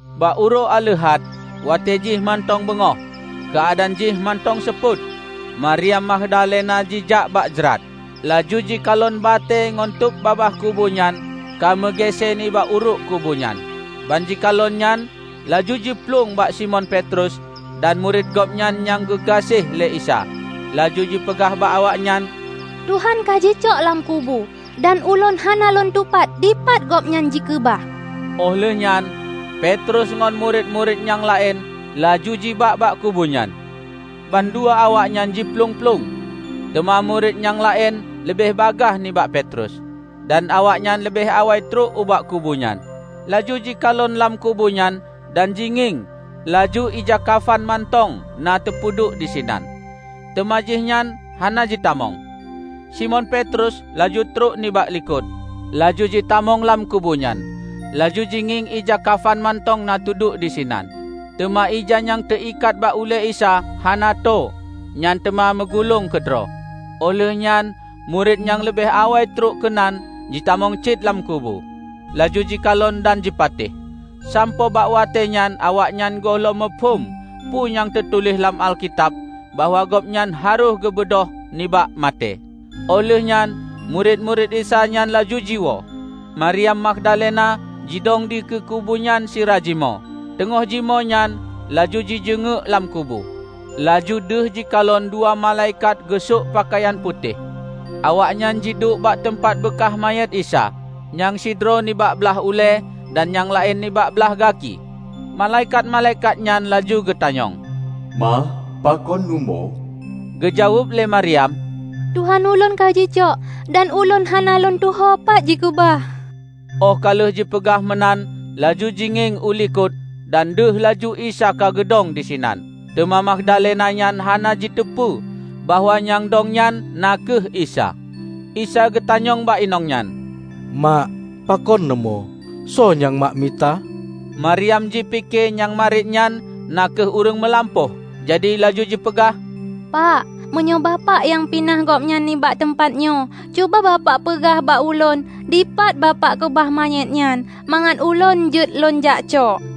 Bak uroe Aleuhat, watée jih mantong beungoh, keuadaan jih mantong seupôt, Maryam Magdalena jijak bak jrat. Laju jikalon batée ngon tôb babah kubu nyan ka meugéesée nibak uruek kubu nyan. Ban jikalon nyan laju jiplueng bak Simon Petrus dan murit Gobnyan nyang geugaséh lé Isa, laju jipeugah bak awaknyan, "Tuhan kajicok lam kubu, dan ulôn hana lôn tupat dipat Gobnyan jikeubah." Óh lheueh nyan Petrus ngon murit-murit nyang laén laju jijak bak kubu nyan. Bandua awaknyan jiplueng-plueng, teuma murit nyang laén leubeh bagaih nibak Petrus, dan awaknyan leubeh awai trok ubak kubu nyan. Laju jikalon lam kubu nyan dan jingieng laju ija kafan mantong na teupeuduek disinan, teuma jihnyan hana jitamong. Simon Petrus laju trok nibak likot, laju jitamong lam kubunyan. Laju jingieng ija kafan mantong na teuduek disinan, teuma ija nyang teuikat bak ulée Isa hana tô nyan teuma meugulong keudroe. Óh lheueh nyan murit nyang leubeh awai trok keunan jitamong cit lam kubu, laju jikalon dan jipatéh. ( Sampoe bak watée nyan awaknyan gohlom muphom peue nyang teutuléh lam Alkitab bahwa Gobnyan harôh geubeudôh nibak maté.) Óh lheuehnyan murit-murit Isa nyan laju jiwoe. Maryam Magdalena jidong dikeue kubu nyan sira jimoe. Teungoh jimoe nyan, laju jijeungeuek lam kubu, laju deuh jikalon dua malaikat geusok peukayan putéh. Awaknyan jiduek bak teumpat beukaih manyét Isa, nyang sidroe nibak blaih ulée, dan nyang laén nibak blaih gaki. Malaikat-malaikat nyan laju geutanyong, "Mak, pakon neumoe?" Geujaweueb lé Maryam, "Tuhan ulôn ka jicok, dan ulôn hana lôn tuho pat jikeubah." Óh ka lheueh jipeugah meunan laju jingieng u likot dan deuh laju Isa ka geudong disinan. Teuma Magdalena nyan hana jiteupeu bahwa nyang dong nyan na kheueh Isa. Isa geutanyong bak inong nyan, "Mak, pakon neumoe, soe nyang mak mita?" Maryam jipike nyang mariet nyan na kheueh ureuëng meulampôh, jadi laju jipeugah, "Pak, meunyoe bapak nyang pinah Gobnyan nibak teumpat nyoe, cuba bapak peugah bak ulôn dipat bapak keubah manyét nyan, mangat ulôn jeuet lôn jakcok."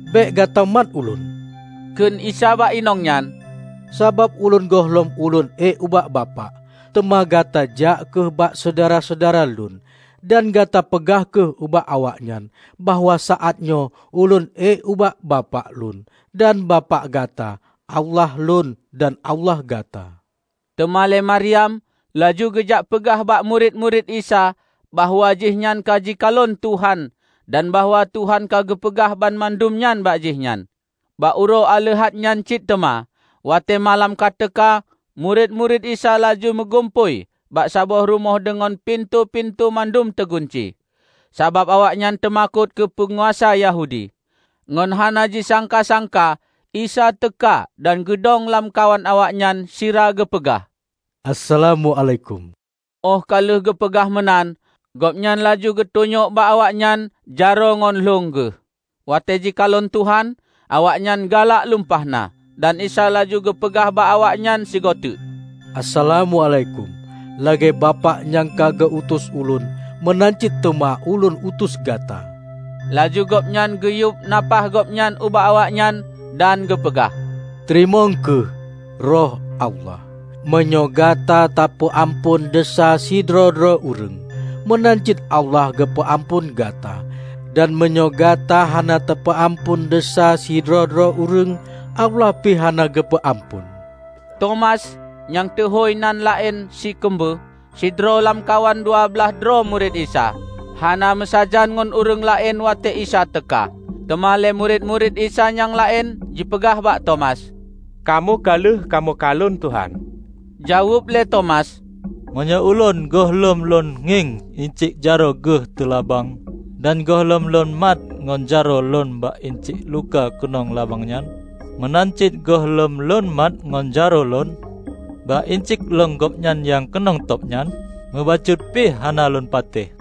"Bék gata mat Ulôn," kheun Isa bak inong nyan, "Sabab Ulôn gohlom Ulôn ék ubak Bapak. Teuma gata jak kheueh bak syedara-syedara Lôn, dan gata peugah kheueh bak awaknyan bahwa saát nyoe Ulôn ék ubak Bapak Lôn dan Bapak gata, Allah Lôn dan Allah gata." Teuma lé Maryam laju geujak peugah bak murit-murit Isa bahwa jihnyan ka jikalon Tuhan dan bahwa Tuhan ka geupeugah banmandum nyan bak jihnyan. Bak uroe Aleuhat nyan cit teuma, watée malam ka teuka, murit-murit Isa laju meugumpôi bak saboh rumoh deungon pintoe-pintoe mandum teugunci, sabab awaknyan teumakot keu peunguasa Yahudi. Ngon hana jisangka-sangka Isa teuka dan geudong lamkawan awaknyan sira geupeugah, "Assalamuálaikum." Óh ka lheueh geupeugah meunan, Gobnyan laju geutunyok bak awaknyan jaroe ngon lhong Geuh. Watée jikalon Tuhan, awaknyan galak lumpah na. Dan Isa laju geupeugah bak awaknyan sigoteuk, "Assalamuálaikum. Lagée Bapak nyang ka geu utus Ulôn, meunan cit teuma Ulôn utus gata." Laju Gobnyan geuyueb nafáh Gobnyan ubak awaknyan dan geupeugah, "Teurimong kheueh Roh Allah. Meunyoe gata tapeuamphon desya sidroe-droe ureuëng, meunan cit Allah geupeu amphon gata. Dan meunyoe gata hana tapeuamphon desya sidroe-droe ureuëng, Allah pi hana geupeu amphon." Tomas (Nyang teuhôi nan laén "Sikeumbeue"), sidroe lam kawan dua blaih droe murit Isa, hana meusajan ngon ureuëng laén watée Isa teuka. Teuma lé murit-murit Isa nyang laén jipeugah bak Tomas, "Kamoe ka lheueh kamoe kalon Tuhan!" Jaweueb lé Tomas, "Meunyoe ulôn gohlom lôn ngieng inciek jaroe Geuh teulabang dan gohlom lôn mat ngon jaroe lôn bak inciek luka keunong labang nyan, meunan cit gohlom lôn mat ngon jaroe lôn bak inciek lhong Gobnyan nyang keunong tôb nyan, mubacut pih hana lôn patéh."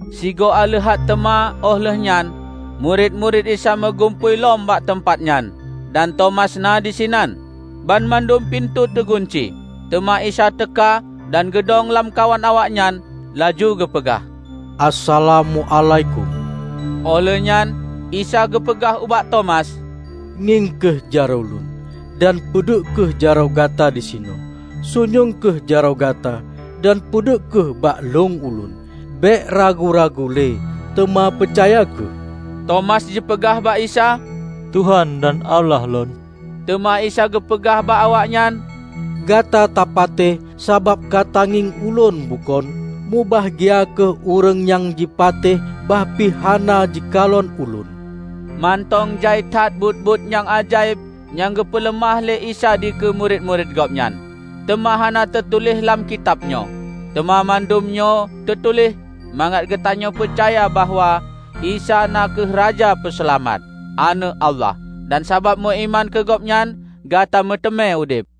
Sigoe Aleuhat teuma óh lheuehnyan murit-murit Isa meugumpôi lom bak teumpat nyan, dan Tomas na disinan. Banmandum pintoe teugunci. Teuma Isa teuka dan geudong lamkawan awaknyan, laju geupeugah, "Assalamuálaikum." Óh lheueh nyan Isa geupeugah ubak Tomas, "Ngieng kheueh jaroe Lôn, dan peuduek kheueh jaroe gata disinoe. Sunyueng kheueh jaroe gata dan peuduek kheueh bak lhong Ulôn. Bék ragu-ragu le, teuma peucaya kheueh!" Tomas jipeugah bak Isa, "Tuhan dan Allah lôn!" Teuma Isa geupeugah bak awaknyan, "Gata tapatéh sabab ka tangieng Ulôn bukon? Mubahgia kheueh ureuëng nyang jipatéh bah pih hana jikalon Ulôn!" Mantong jai that buet-buet nyang ajaéb nyang geupeuleumah lé Isa dikeue murit-murit Gobnyan, teuma hana teutuléh lam kitab nyoe. Teuma mandum nyoe teutuléh, mangat gatanyoe peucaya bahwa Isa na kheueh Raja Peuseulamat, Aneuëk Allah, dan sabab meuiman keu Gobnyan, gata meuteumé udeb.